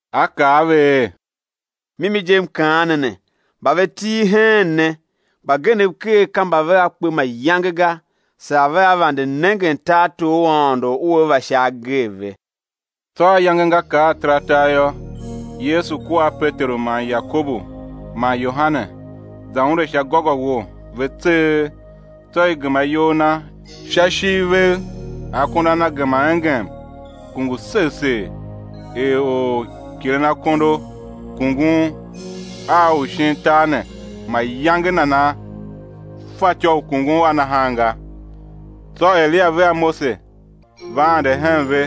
A kaa a ve er: Mimi je, M kaan ne ne, mba ve til heen ne, mbagenev ker ka mba vea kpe mayange ga, saa vea vande nengen tartor u Aôndo ua va sha agee ve. Tsô ayange nga kar ataratar yô, Yesu kua a Peteru man Yakobu man Yohane, za unde sha gôgôwo, ve tseegh; tsô i gema iyol Na sha ishiv vev. Akondo a Na gema engem, kungu segh segh, er orkilenakondo kungun a u shin tar ne mayange nana fatyô u kungun a nahan ga. Tsô Eliya vea Mose va ande hen ve,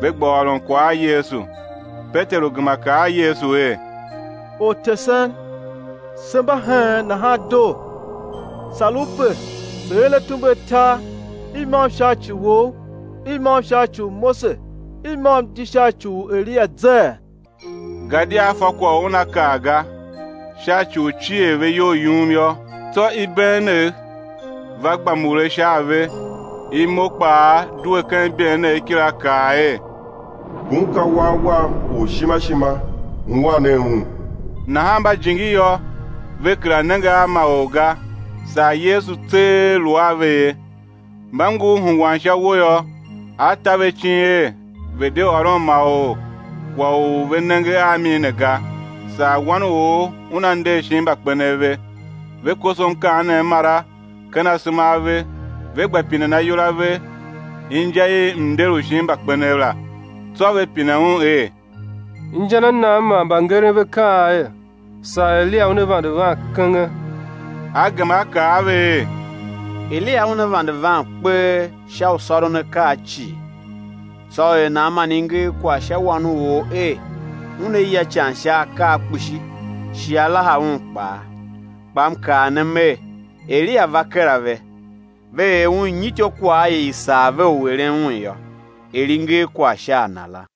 ve gba ôron kwagh a Yesu. Peteru gema kaa a Yesu er: Ortesen, se mba heen, nahan doo; sar U pe se̱ er atumbe atar, i môm sha ci Wou, i môm sha ci u Mose, i môm di sha ci u Eliya zee? Gadia a fa kwagh u una kaa ga, sha ci u cier ve iyol yum yô. Tsô ibeenegh va gba mure sha a ve, imo kpaa due ken ibeenegh kila kaa er: Ngun ka Wan Wam u ishima ishima, ungwan nen Un! Nahan mba jingi yô, ve kera nenge a ma or ga, saa Yesu tseegh lu a ve ye. Mba ngur hungwan sha uwo yô, A ta ve icin er ve̱ de ôron ma or kwagh u ve nenge a mi ne ga, saa Wan u or Una nder shin mbakpenev ve. Ve koso mkaanem mara ken asema a ve, ve gba pinen ayol a ve inja i mnder u shin mbakpenev la. Tsô ve pine Un er: Inja na nan man mbangeren ve kaan er, saa Eliya una vande van kenge? A gema a kaa a ve er: Eliya una vande van kpee sha u sôron akaa cii; tsô er nan man i nger kwagh sha Wan u or er, Una ya ican sha akaa kpishi, shi á laha Un kpaa? Kpa M kaa ne Mer, Eliya va kera ve, ve er un nyi ityôkwagh i i sar ve u eren un yô, er i nger kwagh sha a na la.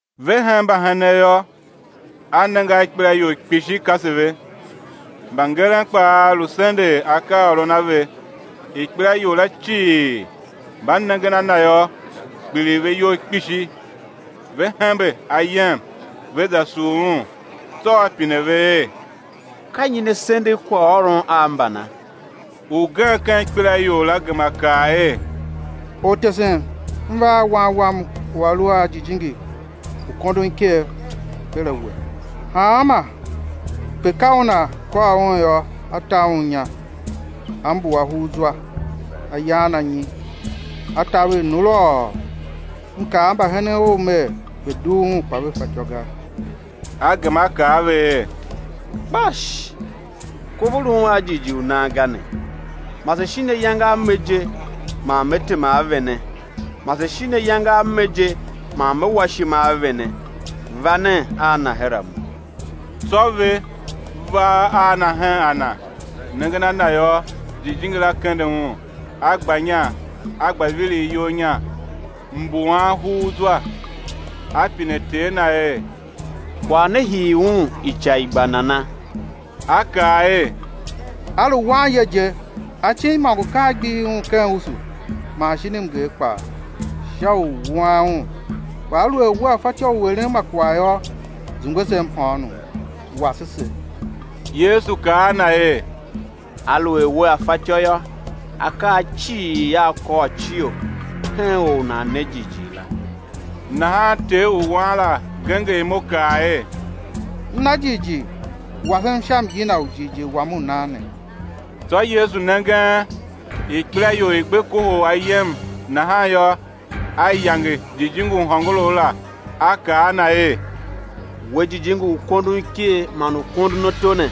Ve hen mbahenen yô, A nenge a ikpelaior kpishi kase ve, mbangeren kpaa lu sendegh akaaôron a ve. Ikpelaior la cii, mba nengen a Na yô, kpiligh ve iyol kpishi, ve hembe ayem, ve za sugh Un. Tsô A pine ve er: Ka nyi ne sendegh kwaghôron a mbana? Ugen ken ikpelaior la gema kaa er: Ortesen, m va a wan wam u a lu a jijingi u kondon iker, her a We. Hanma pe ka una kôr un yô, a ta un inya; a mbuwa hugh zwa, a yan anyi, a taver nulôô. M kaa a mbahenen Ou mer, ve̱ dugh un, kpa ve fatyô ga. A gema A kaa a ve er: Kpash, kov u lun a jighjigh u nan ga ne! Mase shin ayange a me je man Me tema a vene? Mase shin ayange a me je man Me wa ishima a vene? Va nen a na her a Mo. Tsô ve va a na hen a Na. Nengen a Na yô, jijingi la kende un, a gba inya, a gba viligh iyol inya, mbuwan hugh zwa. A pine ter na er: Kwagh ne hii un ica i gba nana? A kaa er: A lu wanye je. Acin imôngo ka a gbihi un ken usu man shin mnger kpaa, sha u wuan un. Kpa aluer Wea fatyô u eren ma kwagh yô, zungwe se mhôônom, wase se. Yesu kaa a na er: Aluer wea fatyô yô, akaa cii a kôrcio hen or u nan ne jighjigh la. Nahan ter u wan la genger imo, kaa er: M na jighjigh, wasem sha myina u jighjigh wam u nan ne. Tsô Yesu nengen ikpelaior i gbe kohol ayem nahan yô, A yange jijingi u hôngorough la A kaa a na er: We, jijingi u kondon iker man u kondon ato ne,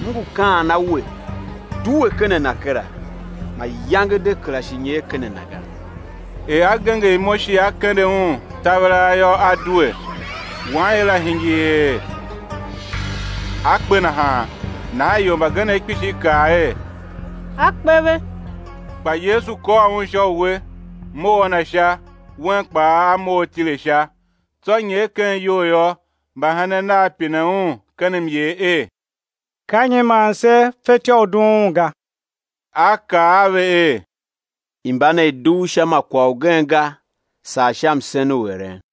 M ngu kaan a we, due ken a na kera, mayange de kera shi nyer ken a na ga. Er a genger imo, shi a kende un taveraa yô, a due. Wanye la hingir er a kpe nahan; nahan ior mbagenev kpishi kaa er: A kpe ve. Kpa Yesu kôr un sha uwe, mough a na sha; wen kpaa a mough a tile sha. Tsô nyer ken iyou yô, mbahenen Nav pine Un ken myer er: Ka nyi man se fetyô u dughun un ga? A kaa a ve er: Imba ne ka i dugh sha ma kwagh ugen ga, saa sha msen u eren.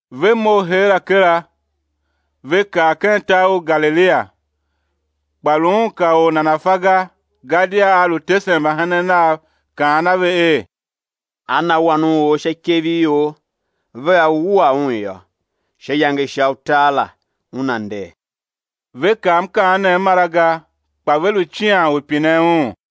Ve mough heera kera, ve kar ken tar u Galilia; kpa lu Un ka or nana̱ fa ga; gadia A lu tesen mbahenen Nav kaan a ve er: Á na Wan u or sha ikev i ior, vea wua Un yô, sha iyange isha utar la, Una nder. Ve kav mkaanem mara ga, kpa ve lu cian u pinen Un.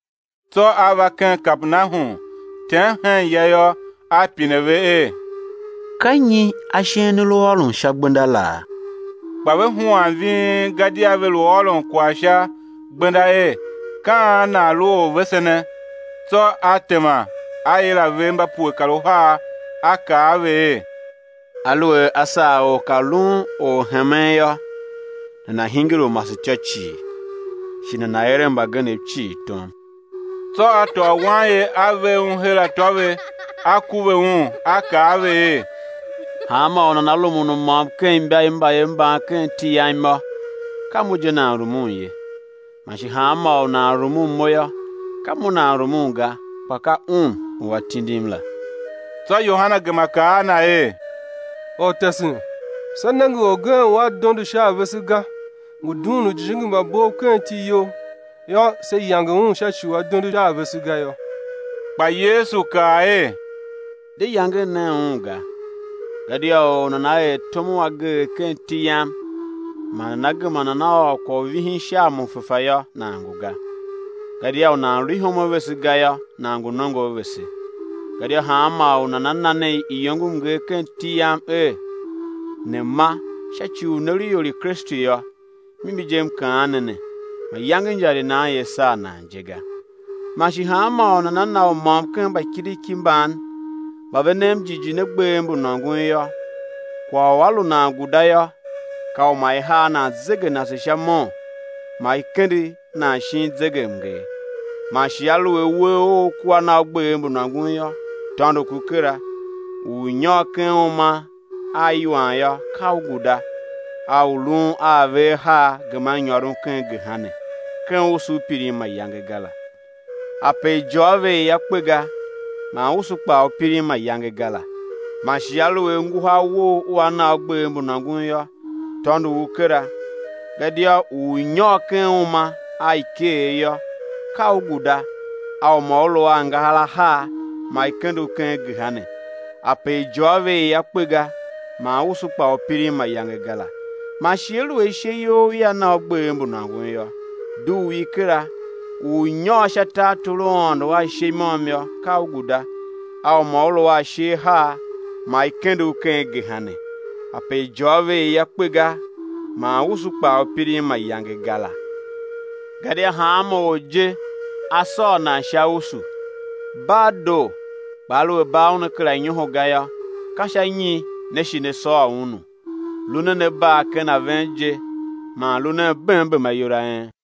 Tsô A va ken Kapernahum. Tem hen ya yô, A pine ve er: Ka nyi ashen ne lu ôron sha gbenda laa? Kpa ve huan ving; gadia ve lu ôron kwagh sha gbenda er, ka an nan lu orvesene? Tsô a tema, A yila ve mba pue kar uhar, A kaa a ve er: Aluer a sar or ka lun orhemen yô, nana̱ hingir u masetyô cii, shi nana̱ eren mbagenev cii tom. Tsô A tôô wanye, a ver un her atô ve, A kuve un, A kaa a ve er: Hanmô u nana rumun u môm ken imba i mbayev mban ken iti Yam yô, ka Mo je nan rumun ye; man shi hanmô u nan rumun Mo yô, ka Mo nan rumun ga, kpa ka Un u A tindim la. Tsô Yohane gema kaa a Na er: Ortesen, se nenge orgen u a dondo sha a vese ga, ngu dughun ujijingi mba bov ken iti You, yô, se yange un sha ci u a dondo sha a vese ga yô. Kpa Yesu kaa er: De yangen nen un ga, gadia or u nana er tom u ageegh ken iti Yam man nana gema nana ôr kwagh u vihin sha a Mo fefa yô, nan ngu ga; gadia u nan lu ihom a vese ga yô, nan ngu nongo a vese. Gadia hanmô u nana na ne iyongomnger ken iti Yam er, ne̱ ma, sha ci u ne lu ior i Kristu yô, mimi je M kaan ne ne, mayange injar i nan ia saa nan je ga. Man shi hanmô u nana na u môm ken mbakiriki mban mba ve nem jighjigh ne, gbev mbu nôngon yô, kwagh u a lu nan guda yô, ka u ma i har nan zegenase sha mon ma i kende nan shin zegemnger. Man shi aluer uwegh ough kua na u gbev mbu nôngon yô, tôndo ku kera; u ú nyôr ken uma a iwan yô, ka u guda a u lun a ave ahar geman nyôron ken gehena, ken usu u pirin mayange ga la [ ape ijôô ve ia kpe ga, man usu kpaa u pirin mayange ga la.] Man shi aluer nguhar wou ua na u gbev mbu nôngon yô, tôndo u kera; gadia u ú nyôr ken uma a ikeer yô, ka u guda a u ma u lu a angahar ahar ma i kende u ken gehena [ ape ijôô ve ia kpe ga, man usu kpaa u pirin mayange ga la.] Man shi aluer ishe you ia na u gbev mbu nôngon yô, dugh i kera; u ú nyôr sha tartor u Aôndo a ishe i môm yô, ka u guda a u ma u lu a ashe ahar ma i kende u ken gehena, ape ijôô ve ia kpe ga, man usu kpaa u pirin mayange ga la. Gadia hanma or je, á sôr nan sha usu. Bar doo, kpa aluer bar una kera nyoho ga yô, ka sha nyi né shi né sôr unu? Lu nen a bar ken a ven je, man lu nen bem bem ayol a en.